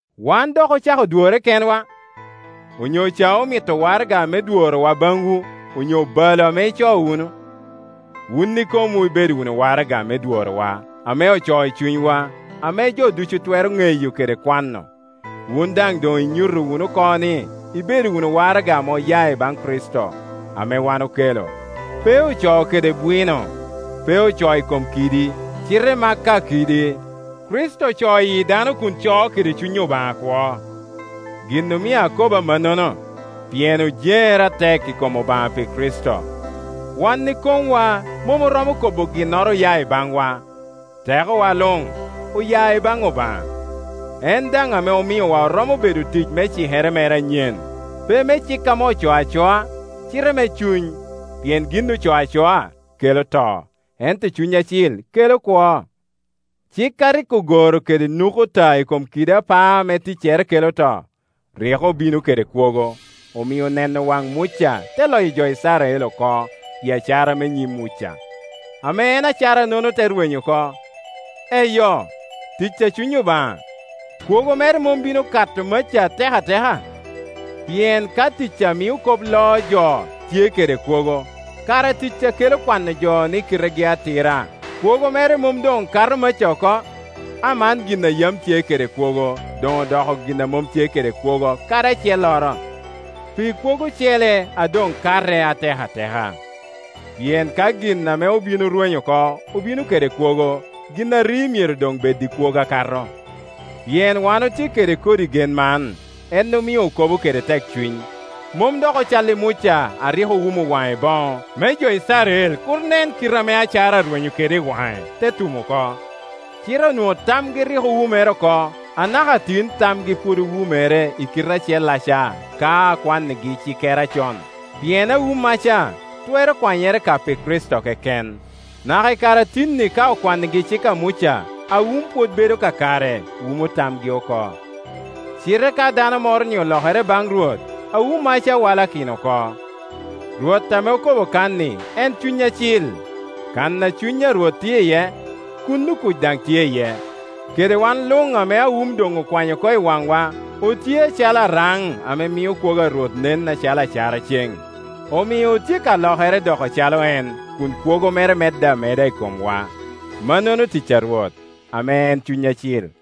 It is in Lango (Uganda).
Wan dok ocako dworre kenwa? Onyo ca omito waraga me dworo wa baŋwu, on yo balo ame icoo wunu? Wun ikomwu ibedo wunu waraga me dworowa, ame ocoo i cunywa, ame jo ducu twero ŋeyo kede kwano. Wun daŋ doŋ inyuto wunu oko ni ibedo wunu waraga ame oya i baŋ Kricito, ame wan okelo. Pe ocoo kede bwino, pe ocoo i kom kidi; cite ma ka kidi, Kricito ocoo i yi dano kun coo kede Cuny Obaŋa akwo. Gin omio akobo amannono, pien ojeŋere atek i kom Obaŋa pi Kricito. Wan ikomwa mom oromo kobo ni ginnoro oya i baŋwa; tekowa luŋ oya ibaŋ Obaŋa. En daŋ ame omiowa oromo bedo otic me cikere mere anyen, pe me cik ame ocoo acoa, cite me Cuny; pien gin ocoo acoa kelo to, ento Cuny Acil kelo kwo. Cik a rik ogoro kede nukuta i kom kidi apaa ame ticcere kelo to, rik obino kede kwogo, omio neno waŋ Muca te loyo jo Icrael oko pi acara me nyim Muca, ame en acara-nono te rwenyo oko. Eyo, tic a Cuny Obaŋa, kwogo mere mom bino kato maca atek ateka? Pien ka tic a mio kop loo jo tye kede kwogo, kara tic a kela kwano jo ni kitegi atira kwogo mere mom doŋ kato maca oko? Aman gin a yam tye kede kwogo doŋ odoko gin a mom tye kede kwogo kadi acelloro, pi kwogo ocele a doŋ kate atek ate ka. Pien ka gin ame obin orwenyo oko obino kede kwogo, gin a ri myero doŋ bed i kwogo akato. Pien wan otye kede kodi gen man, en omio okobo kede tekcuny. Mom dok ocal i Muca a rik owumo waŋe i boŋo, me jo Icrael kur nen kite ame acara arwenyo kede i waŋe, te tum oko. Cite onwoŋo tamgi rik owumere oko; anaka tin tamgi pwod owumere i kite acellaca ka akwannigi cikere acon, pien awummaca twero kwanyere ka pi Kricito keken. Naka i kare a tin-ni ka okwannigi cik a Muca, awum pwod bedo kakare, wumo tamgi oko. Cite ka dano moro-ni olokere baŋ Rwot, awummaca walakino oko. Rwot ame okobo kan-ni en Cuny Acil; kan a Cuny Rwot tye iye, kuno kuc daŋ tye iye. Kede wan luŋ ame awum doŋ okwanyo oko i waŋwa otye acalo araŋ ame mio kwogo a Rwot nen acalo acara cen, omio otye ka lokere doko calo en, kun kwogo mere medde ameda i komwa; mannono tic a Rwot, ame en Cuny Acil.